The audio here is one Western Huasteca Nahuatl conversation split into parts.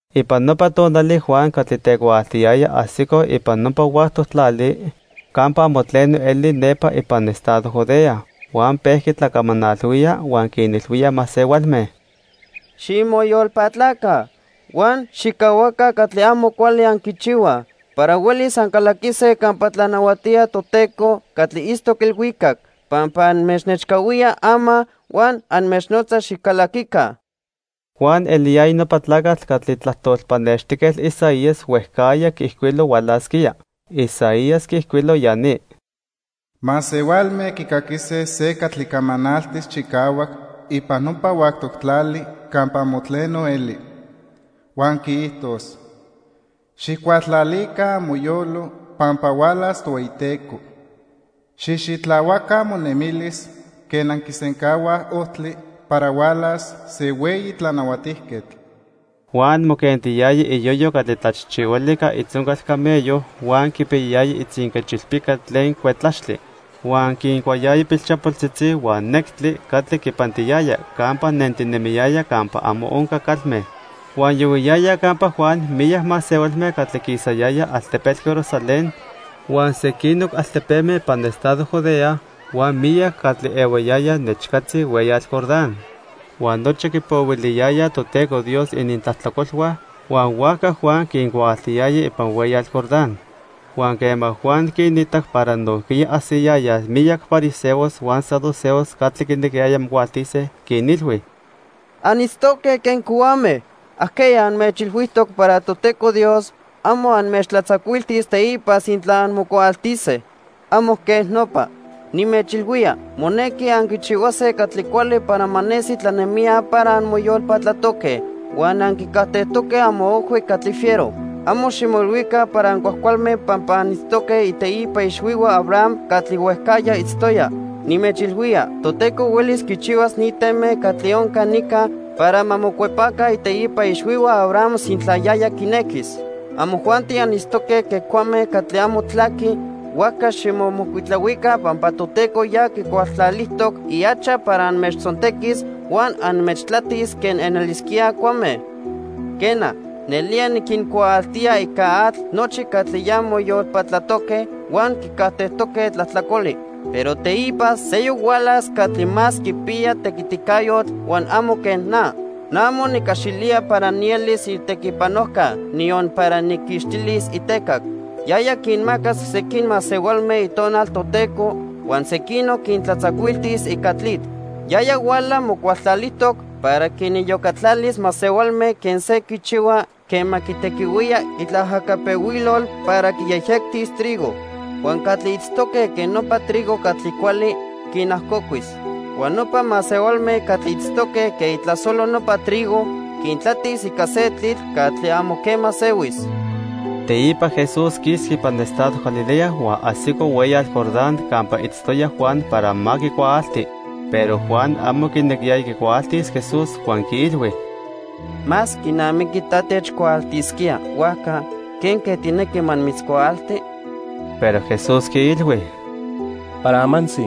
Ipan nopa tonali Juan catli tecuaaltiyaya ajsico ipan nopa huactoc tlali campa amo tleno eli nepa ipan estado Judea. Huan pejqui tlacamanalhuía, huan quinilhuía masehualme: "Ximoyolpatlaca huan xijcahuaca catli amo cuali anquichihuaj para huelis ancalaquise campa tlanahuatía Toteco catli itztoc ilhuicac pampa anmechnechcahuía ama huan anmechnotza xicalaquica." Juan eliyaya nopa tlacatl catli tlajtol pannextijquetl Isaías huejcajya quiijcuilo hualasquía. Isaías quiijcuilo ya ni: "Masehualme quicaquise se catli camanaltis chicahuac ipan nopa huactoc tlali campa amo tleno eli. Huan quiijtos: 'Xijcualtlalica amoyolo pampa hualas Tohueyiteco. Xijxitlahuaca amonemilis quen anquisencahuaj ojtli para hualas se hueyi tlanahuatijquetl.' " Juan moquentiyaya iyoyo catli tlachijchihuali ica itzoncal camello, huan quipiyayaya itzinquechilpica tlen cuetlaxtli. Huan quincuayaya pilchapoltzitzi huan nectli catli quipantiyaya campa nentinemiyaya campa amo onca calme. Huan yohuiyayaj campa Juan miyac masehualme catli quisayayaj altepetl Jerusalén huan sequinoc altepeme ipan estado Judea huan miyac catli ehuayayaj nechcatzi hueyatl Jordán. Huan nochi quipohuiliyayaj Toteco Dios inintlajtlacolhua, huan huajca Juan quincuaaltiyaya ipan hueyatl Jordán. Huan quema Juan quinitac para nojquiya ajsiyayaj miyac fariseos huan saduceos catli quinequiyayaj mocuaaltise, quinilhui: "Anitztoque quen cohuame. ¿Ajqueya anmechilhuijtoc para Toteco Dios amo anmechtlatzacuiltis teipa sintla anmocuaaltise? Amo quej nopa. Nimechilhuía monequi anquichihuase catli cuali para ma nesi tlanemijya para anmoyolpatlatoque huan anquicajtejtoque amoojhui catli fiero. Amo ximoilhuica para ancuajcualme pampa anitztoque iteipa ixhuihua Abraham catli huejcajya itztoya. Nimechilhuía Toteco huelis quichihuas ni teme catli onca nica para ma mocuepaca iteipa ixhuihua Abraham sintla yaya quinequis. Amojuanti anitztoque quen cuame catli amo tlaquij, huajca ximomocuitlahuica pampa Toteco ya quicualtlalijtoc ihacha para anmechtzontequis huan anmechtlatis quen anelisquíaj cuame. "Quena, nelía niquincuaaltía ica atl nochi catli ya moyolpatlatoque huan quicajtejtoque tlajtlacoli. Pero teipa seyoc hualas catli más quipiya tequiticayotl huan amo quen na. Na amo nicaxilía para nielis itequipanojca niyon para nijquixtilis itecac. Yaya quinmacas sequin masehualme Itonal Toteco huan sequinoc quintlatzacuiltis ica tlitl. Yaya huala mocualtlalijtoc para quiniyocatlalis masehualme quen se quichihua quema quitequihuía itlaajacapehuilol para quiyejyectis trigo. Huan catli itztoque quen nopa trigo catli cuali, quinajocuis. Huan nopa masehualme catli itztoque quen itlasolo nopa trigo, quintlatis ica se tlitl catli amo quema sehuis." Teipa Jesús quisqui ipan estado Galilea huan ajsico hueyatl Jordán campa itztoya Juan para ma quicuaalti. Pero Juan amo quinequiyaya quicuaaltis Jesús huan quiilhui: —Más quinamiqui ta techcuaaltisquía, huajca ¿quenque tijnequi ma nimitzcuaalti? Pero Jesús quiilhui: —Para amantzi,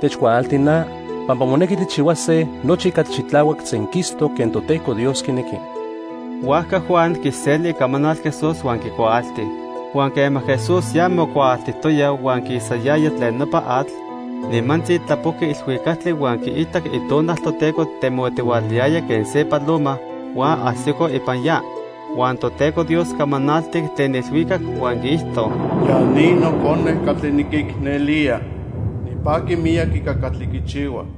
techcuaalti na pampa monequi tijchihuase nochi catli xitlahuac senquistoc quen Toteco Dios quinequi. Huajca Juan quiseli icamanal Jesús huan quicuaalti. Huan quema Jesús ya mocuaaltijtoya huan quisayaya tlen nopa atl, nimantzi tlapojqui ilhuicactli huan quiitac Itonal Toteco temotihualayaya quen se paloma huan ajsico ipan ya. Huan Toteco Dios camanaltic tlen ilhuicac huan quiijto: "Ya ni Nocone catli niquicnelía. Nipaqui miyac ica catli quichihua."